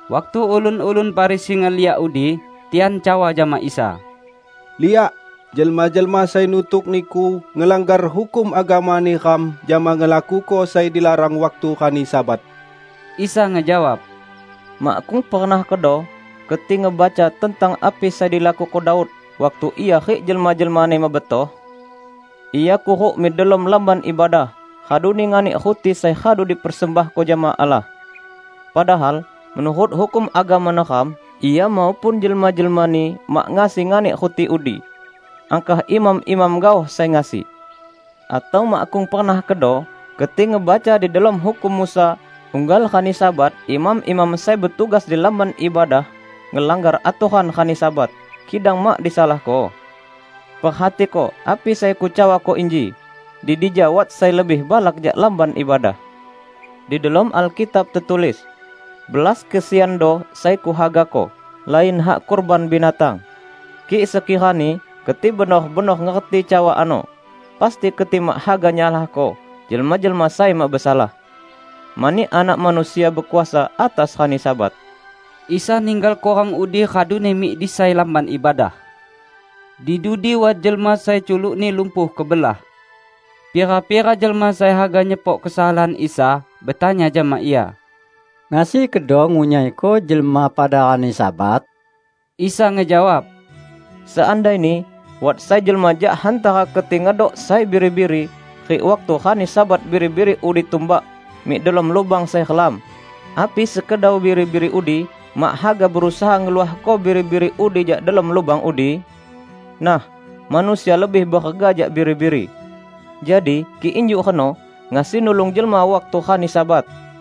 Waktu ulun-ulun Farisi ngeliak udi, tian cawa jama Isa, "Liak! Jelma-jelma sai nutuk Niku ngelanggar hukum agama neram jama ngelakuko sai dilarang waktu rani Sabat." Isa ngejawab, "Makkung pernah kedo keti ngebaca tentang api sai dilakuko Daud waktu ia rik jelma-jelmani mebetoh? Ia kuruk mik delom Lamban Ibadah; raduni nganik ruti sai radu dipersembahko jama Allah. Padahal menurut hukum agama neram, ia maupun jelma-jelmani mak ngasi nganik ruti udi -- angkah imam-imam gaoh sai ngasi. Atau makkung pernah kedo keti ngebaca di delom hukum Musa unggal rani Sabat imam-imam sai betugas di Lamban Ibadah, ngelanggar atoran rani Sabat, kidang mak disalahko? Perhatiko api sai Kucawako inji: di dija wat sai lebih balak jak Lamban Ibadah. Di delom Alkitab tetulis: Belas kesiando sai Kuhagako, lain hak kurban binatang. Kik sekirani keti benor-benor ngerti cawa ano, pasti keti mak haga nyalahko jelma-jelma sai mak besalah. Mani Anak Manusia bekuasa atas rani Sabat." Isa ninggalko rang udi raduni mik di sai lamban ibadah. Di dudi wat jelma sai culukni lumpuh kebelah. Pira-pira jelma sai haga nyepok kesalahan Isa, betanya jama Ia, "Ngasi kedo ngunyaiko jelma pada rani Sabat?" Isa ngejawab, "Seandaini wat sai jelma jak hantara keti ngedok sai biri-biri, rik waktu rani Sabat biri-biri udi tumbak mik delom lubang sai relam; api sekedau biri-biri udi mak haga berusaha ngeluahko biri-biri udi jak delom lubang udi? Nah, manusia lebih berega jak biri-biri! Jadi, kik injuk reno, ngasi nulung jelma waktu rani Sabat."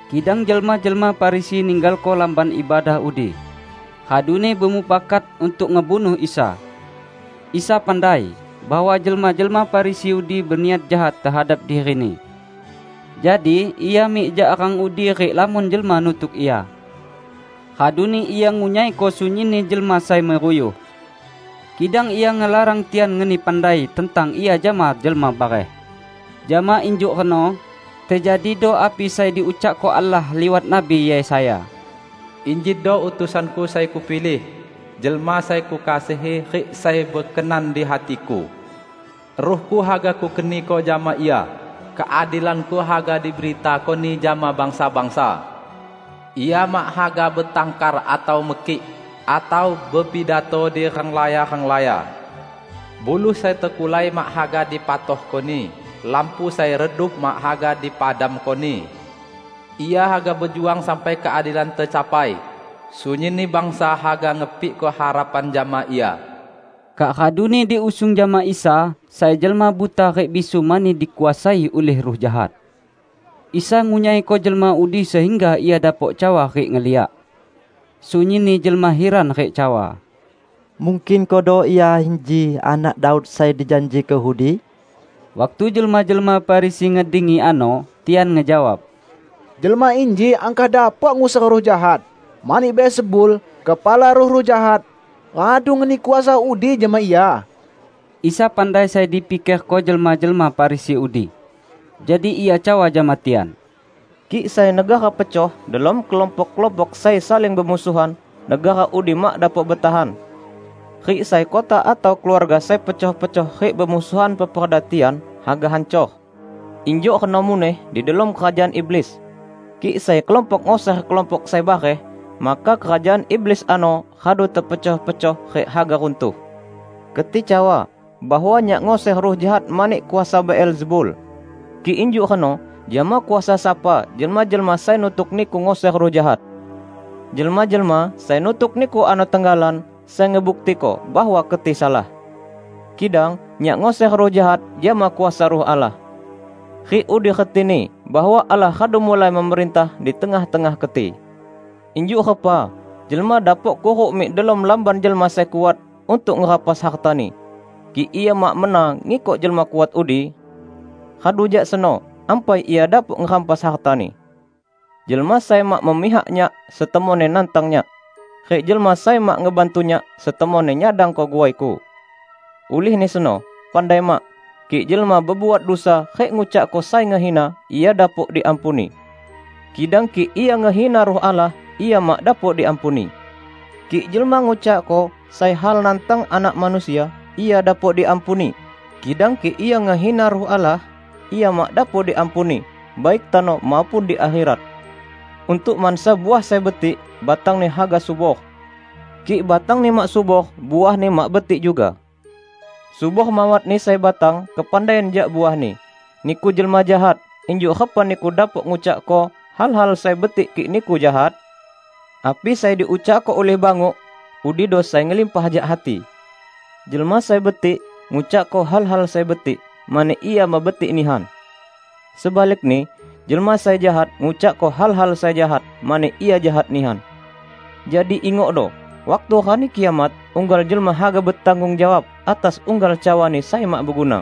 Kidang jelma-jelma Farisi ninggalko lamban ibadah udi, raduni bemufakat untuk ngebunuh Isa. Isa pandai bahwa jelma-jelma Farisi udi beniat jahat tehadap diri-Ni. Jadi Ia mik jak rang udi rik lamon jelma nutuk Ia. Raduni Ia ngunyaiko sunyinni jelma sai meruyuh. Kidang Ia ngelarang tian ngeni pandai tentang Ia jama jelma bareh. Jama injuk reno tejadido api sai diucakko Allah liwat Nabi Yesaya, "Injido utusan-Ku sai Kupilih, Jelma sai Kukasihi rik sai bekenan di hati-Ku. Ruh-Ku haga Kukeniko jama Ia, keadilan-Ku haga diberitako-Ni jama bangsa-bangsa. Ia mak haga betangkar atau mekik, atau bepidato di renglaya-renglaya. Buluh sai tekulai mak haga dipatahko-Ni lampu sai redup mak haga dipadamko-Ni. Ia haga bejuang sampai keadilan tecapai; sunyinni bangsa haga ngepikko harapan jama Ia." Kak raduni diusung jama Isa sai jelma buta rik bisu mani dikuasai ulih ruh jahat. Isa ngunyaiko jelma udi sehingga ia dapok cawa rik ngeliak. Sunyinni jelma hiran rik cawa, "Mungkin kedo Ia inji Anak Daud sai dijanjiko udi?" Waktu jelma-jelma Farisi ngedengi ano, tian ngejawab, "Jelma inji angkah dapok nguser ruh jahat, mani Beelzebul, kepala ruh-ruh jahat, radu ngeni kuasa udi jama Ia." Isa pandai sai dipikerko jelma-jelma Farisi udi. Jadi Ia cawa jama tian, "Kik sai negara pecoh delom kelompok-kelompok sai saling bemusuhan, negara udi mak dapok betahan. Rik sai kota atau keluarga sai pecoh-pecoh rik bemusuhan peperda tian haga hancor. Injuk reno muneh di delom kerajaan iblis; kik sai kelompok nguser kelompok sai bareh, maka kerajaan iblis ano radu tepecoh-pecoh rik haga runtuh. Keti cawa bahwa Nyak nguser ruh jahat mani kuasa Beelzebul. Kik injuk reno jama kuasa sapa jelma-jelma sai nutuk niku nguser ruh jahat. Jelma-jelma sai nutuk niku ano tenggalan sai ngebuktiko bahwa keti salah! Kidang Nyak nguser ruh jahat jama kuasa Ruh Allah. Rik udi retini bahwa Allah radu mulai memerintah di tengah-tengah keti. Injuk repa jelma dapok kuruk mik delom lamban jelma sai kuat untuk ngerampas hartani, kik ia mak mena ngikok jelma kuat udi? Radu jak seno, ampai ia dapok ngerampas hartani. Jelma sai mak memihak Nyak setemonni nantang Nyak. Rik jelma sai mak ngebantu Nyak setemonni nyadangko guai-Ku! Ulihni seno, pandai mak, kik jelma bebuat dusa rik ngucakko sai ngehina, ia dapok diampuni! Kidang kik ia ngehina Ruh Allah, ia mak dapok diampuni! Kik jelma ngucakko sai hal nantang Anak Manusia, ia dapok diampuni, kidang kik ia ngehina Ruh Allah, ia mak dapok diampuni, baik tano maupun di akherat!" "Untuk mansa uah sai betik, batangni haga subor. Kik batangni mak subor, uahni mak betik juga. Subor mawatni sai batang kepandaian jak uahni. Niku jelma jahat, injuk repa niku dapok ngucakko hal-hal sai betik kik niku jahat? Api sai diucakko ulih banguk udido sai ngelimpah jak hati! Jelma sai betik ngucakko hal-hal sai betik mani ia mebetik nihan. Sebalikni, jelma sai jahat ngucakko hal-hal sai jahat mani ia jahat nihan. Jadi, ingokdo: waktu Rani Kiamat, unggal jelma haga betanggung jawab atas unggal cawani sai mak beguna.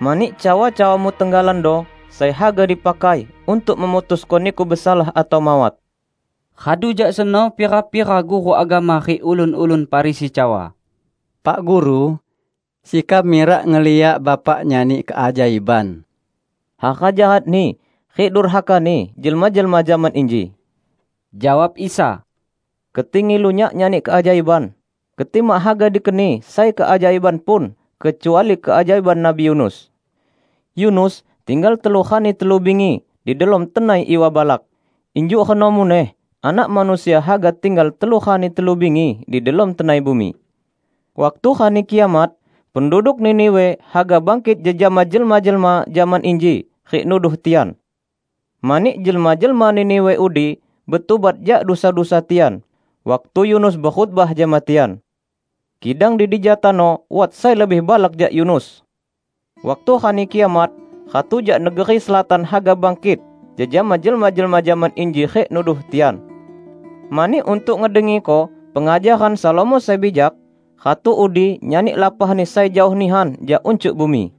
Mani cawa-cawamu tenggalando sai haga dipakai untuk memutusko niku besalah atau mawat." Radu jak seno pira-pira guru agama rik ulun-ulun Farisi cawa, "Pak Guru, sekam mirak ngeliak Bapak nyani keajaiban." "Hara jahatni rik durhakani jelma-jelma zaman inji!" jawab Isa. "Keti ngilu Nyak nyani keajaiban? Keti mak haga dikeni sai keajaiban pun, kecuali keajaiban Nabi Yunus. Yunus tinggal telu rani telu bingi di delom tenai iwa balak. Injuk reno muneh Anak Manusia haga tinggal telu rani telu bingi di delom tenai bumi. Waktu Rani Kiamat, penduduk Niniwe haga bangkit jejama jelma-jelma zaman inji rik nuduh tian. Mani jelma-jelma Niniwe udi betubat jak dusa-dusa tian, waktu Yunus bekhotbah jama tian. Kidang di dija tano wat sai lebih balak jak Yunus! Waktu Rani Kiamat, ratu jak negeri Selatan haga bangkit jejama jelma-jelma zaman inji rik nuduh tian. Mani untuk ngedengiko pengajaran Salomo sai bijak, ratu udi nyani lapahni sai jaoh nihan jak uncuk bumi.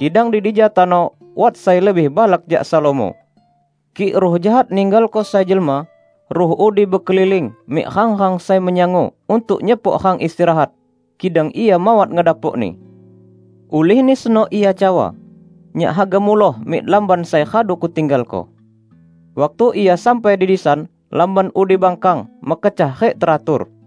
Kidang di dija tano wat sai lebih balak jak Salomo!" "Kik ruh jahat ninggalko sai jelma, ruh udi bekeliling mik rang-rang sai menyangu untuk nyepok rang istirahat, kidang ia mawat ngedapokni. Ulihni seno ia cawa, 'Nyak haga muloh mik lamban sai radu kutinggalko.' Waktu ia sampai di disan, lamban udi bangkang, mekecah rik teratur.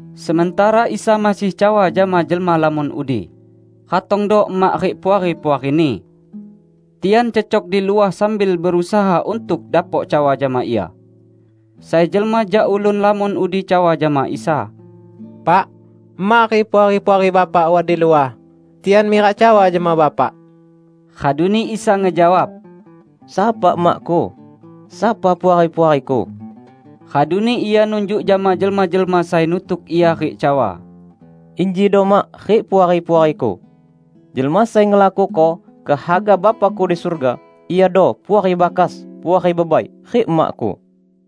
Sementara Isa masih cawa jama jelma lamon udi, ratongdo emak rik puari-puari-Ni. Tian cecok di luah sambil berusaha untuk dapok cawa jama Ia. Sai jelma jak ulun lamon udi cawa jama Isa, "Pak, emak rik puari-puari Bapak wat di luah. Tian mirak cawa jama Bapak." Raduni Isa ngejawab, "Sapa emak-Ku? Sapa puari-puari-Ku?" Raduni Ia nunjuk jama jelma-jelma sai nutuk Ia rik cawa, "Injido mak rik puari-puari-Ku. Jelma sai ngelakuko kehaga Bapa-Ku di surga, iado puari bakas, puari bebai, rik emak-Ku."